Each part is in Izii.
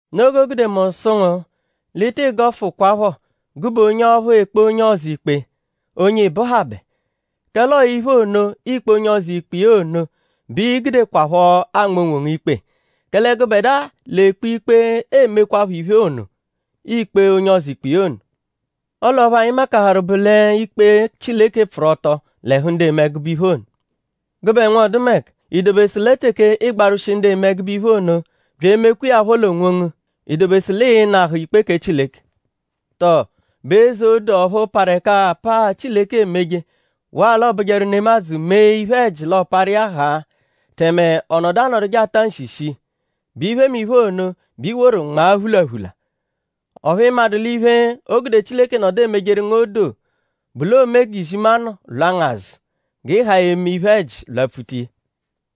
Noo g'o gude mu sụ ngu l'ị tị gọfukwapho gụbe onye ọphu ekpe onye ọzo ikpe; onye ị bụhabe. Kẹle ọo iphe ono, iikpe onye ọzo ikpe iya ono bẹ i gudekwaphọ anma onwongu ikpe. Kẹle gụbedua, l'ekpe ikpe emekwaphọ iphe ono, iikpe onye ọzo ikpe iya ono. Ọle ọphu anyi makaharụ bụ l'ikpe Chileke pfụru-ọto l'ẹhu ndu eme ẹgube iphe ono. Gụbe nwọdumeka;?I dobesu lẹ teke ịigbarwushije ndu eme ẹgube iphe ono; bya emekwa iya phọ l'onwongu;?i dobesu l'ịi-nahụ ikpe kẹ Chileke? ?Tọo; bụ eze odoo ọphu parụ ẹka apaa, Chileke emeje; waa l'ọ bụjeru nemadzụ -mee iphe-ẹji l'ọ parụ iya haa; tẹme ọ nọdu anọduje ata nshi shii;?bụ iphemiphe ono, bẹ i woru nmaa phulaphula? Ọphu ị madụ l'iphe, o gude Chileke nọdu emejeru ngu odoo bụ l'oome g'izimanụ lwa ngu azụ; g'ị haa eme iphe-ẹji lwapfuta iya.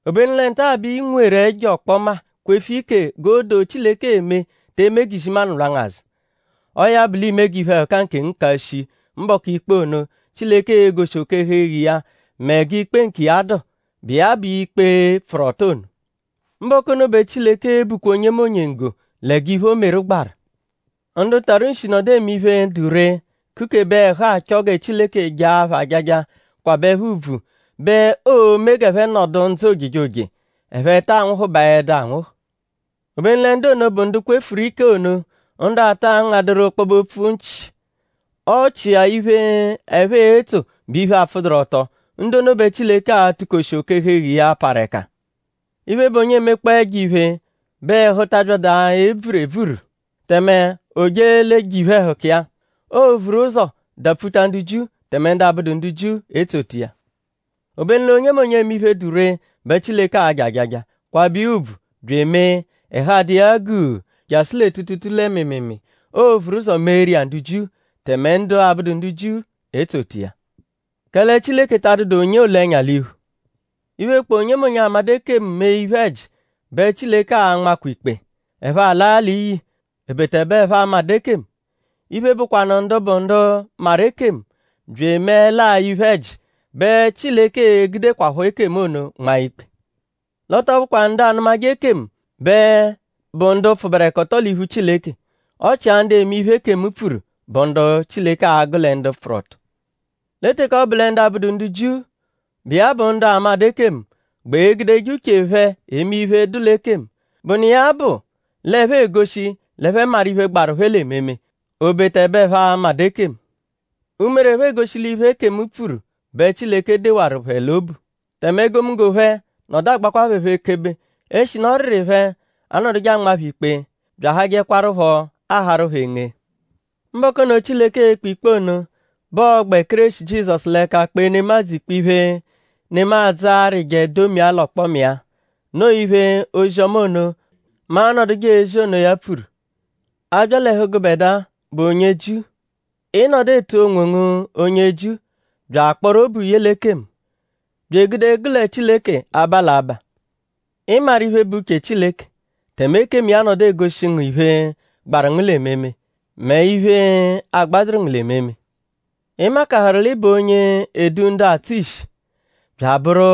Obenu lẹ nta-a bẹ i nweru ẹjo ọkpoma kwefu ike g'odoo, Chileke eme te eme g'izimanụ lwa ngu azụ. Ọo ya bụ l'iime g'iphe-ẹhuka nkengu ka shii mbọku ikpe ono, Chileke e-goshi oke-ẹhu-eghu iya mẹ g'ikpe nkiya dụ, bụ iya bụ ikpe pfụru-ọto ono. Mbọku ono bẹ Chileke e-bukwa onyemonye nggo lẹ g'iphe, o meru gbaru. Ndu tarụ nshi nọdu eme iphe, dụ ree; kukebe ẹhu achọ gẹ Chileke jaa phẹ ajaja; kwabẹ phẹ ùbvù; bẹ oo-me g'ẹphe nọdu ndzụ ojejoje; ẹphe taa nwụhubaedu anwụhu. Obenu lẹ ndu ono, bụ ndu kwefuru ike ono; ndu ata ngadụru ọkpobe-opfu nchị; ọ chịa iphe, ẹphe etso bụ iphe, apfụduru-ọto; ndu ono bẹ Chileke a-tụ-koshi oke-ẹhu-eghu iya, parụ ẹka. Iphe, bụ onye emekpọo ẹjo-iphe bẹ ẹhu ta abyadụ eburu ebvuru; tẹme o je l'e-je iphe-ẹhuka iya. Oo-vuru ụzo dapfuta ndu Jiu; tẹme ndu abụdu ndu Jiu etsota iya. Obenu l'onyemonye, eme iphe, dụ ree bẹ Chileke a-ja ajaja; kwabẹ iya ùbvù bya emee; ẹhu adụ iya guu jasụ lẹ tuutuutuu lẹ mịimiimii. Oo-vuru ụzo meeru iya ndu Jiu; tẹme ndu abụdu ndu Jiu etsota iya. Kẹle Chileke ta adụdu onye oole ẹnya l'iphu. Iphe, bụkpoo onyemonye, amadụ ekemu mee iphe-ẹji bẹ Chileke a-nmakwa ikpe; ẹphe alaa l'iyi; obeta ẹbe ẹphe amadụ ekemu. Iphe, bụkwanu ndu bụ ndu maru ekemu bya emeẹlaa iphe-ẹji bẹ Chileke e-gudekwaphọ ekemu ono nmaa ikpe. L'ọ tọ bụkwa ndu anụmaje ekemu bẹ bụ ndu pfụberekoto l'iphu Chileke; ọ chia ndu eme iphe, ekemu pfuru bụ ndu Chileke a-gụ lẹ ndu pfụru-ọto. Lẹ teke ọ bụ lẹ ndu abụdu ndu Jiu, bụ iya bụ ndu amadụ ekemu gbẹ egudeje uche phẹ eme iphe, dụ l'ekemu; bụ nụ iya-a bụ l'ẹphe egoshi l'ẹphe maru iphe, gbaru phẹ l'ememe; obeta ẹbe ẹphe amadụ ekemu. Umere phẹ egoshi l'iphe, ekemu pfuru bẹ Chileke dewaru phẹ l'obu. Tẹme egomunggo phẹ nọdu agbakwa phẹ phọ ekebe; eshinu ọriri phẹ anọduje anmaa phẹ ikpe bya ahajẹkwarupho aharu phẹ enge. Mbọku ono, Chileke e-kpe ikpe ono bẹ ọo-gbẹ Kéreshi Jizọsu l'ẹka kpee nemadzụ ikpe iphe, nemadzụ arịje domia l'ọkpoma iya. Noo iphe, ozi-ọma ono, mu anọduje ezi onoya pfuru. A bya l'ẹhu gụbedua, bụ onye Jiu; ị nọdu etu onwongu onye Jiu bya akpọru obu ye l'ekemu; bya egude gụle Chileke aba l'abaa. Ị maru iphe, bụ uche Chileke; tẹme ekemu iya nọdu egoshi ngu iphe, gbaru ngu l'ememe; mẹ iphe, agbadụru ngu l'ememe. Ị makaharụ l'ị bụ onye edu ndu atsụ ishi; bya abụru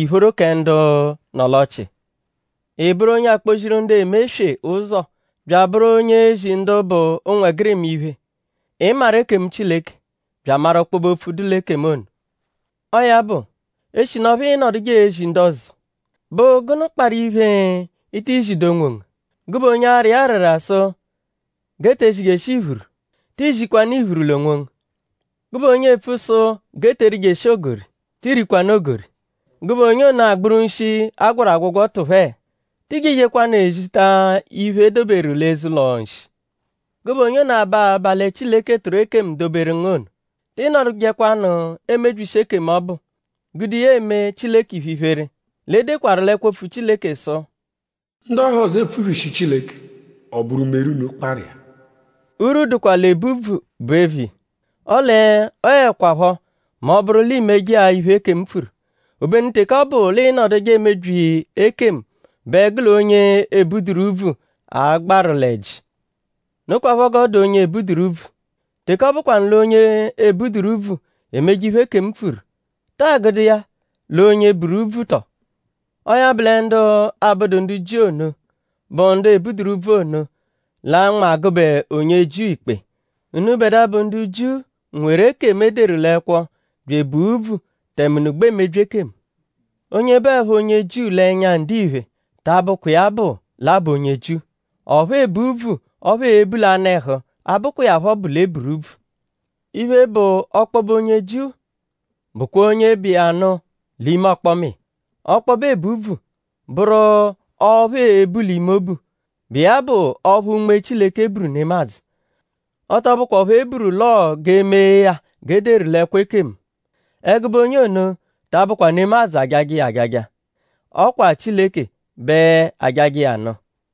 ìphóró kẹ ndu nọ l'ọchii. Ị bụru onye akpọ-ziru ndu eme eswe ụzo; bya abụru onye ezi ndu bụ ụnwegirima iphe. Ị maru ekemu Chileke; bya amaru ọkpobe-opfu dụ l'ekemu ono. Ọo ya bụ; eshi ọphu ịinoduje ezi ndu ọzo;?bụ gụnu kparụ iphe, i tii zidu onwongu? Gụbe onye ara iya arara sụ g'e te zijeshi iphuru;?tii zikwanụ iphuru l'onwongu? Gụbe onye epfu sụ g'e te erijeshi ogori;?ti rikwanụ ogori? Gụbe onye ono, agbụru nshi, a gwọru agwọgwo tụphe?ti jejekwanụ ezita iphe, e doberu l'eze-ụlo-nshi? Gụbe onye ono, aba abaa lẹ Chileke tụru ekemu doberu ngu ono;?tị nọdujekwanu emebyishi ekemu ọbu; gude iya eme Chileke iphe-iphere. L'e dekwaru l'ẹkwo-opfu Chileke sụ: “Ndu ọhozo epfubyishi Chileke; ọ bụru umere unu kparụ iya.” Urwu dụkwa l'ebu úbvù bụ eviya; ọle ọo 'ẹkwapho mẹ ọ -bụru l'i meje-a iphe, ekemu pfuru. Obenu teke ọ bụ l'ịinoduje emebyi ekemu bẹ gụ l'onye ebuduru úbvù a-gbaru l'ẹji. Nokwaphọ g'ọ dụ onye ebuduru úbvù. Teke ọ bụkwanu l'onye ebuduru úbvù emeje iphe, ekemu pfuru;?ta agụdu iya l'onye buru úbvù tọo? Ọo ya bụ lẹ ndu abụdu ndu Jiu ono, bụ ndu ebuduru úbvù ono l'a-nma gụbe onye Jiu ikpe. Unubẹdua, bụ ndu Jiu nweru ekemu, e deru l'ẹkwo bya ebua úbvù; tẹme unu gbẹ emebyi ekemu. Onye bụepho onye Jiu l'ẹnya ndiphe ta bụkwa iya bụ l'a bụ onye Jiu. Ọphu ebu úbvù ọphu eebu l'anụ-ẹhu abụkwa iya phọ bụ l'e buru úbvù. Iphe, bụ ọkpobe onye Jiu bụkwa onye bụ iya nụ l'ime ọkpoma iya. Ọkpobe ebu úbvù; bụru ọphu eebu l'ime obu, bụ iya bụ ọphu Unme Chileke buru nemadzụ; ọ tọ bụkwa ọphu e buru l'ọo g'e mee ya g'e deru l'ẹkwo ekemu. Ẹgube onye ono ta abụkwa nemadzụ ajajẹ iya ajaja; ọ kwa Chileke bẹ ajajẹ iya nụ.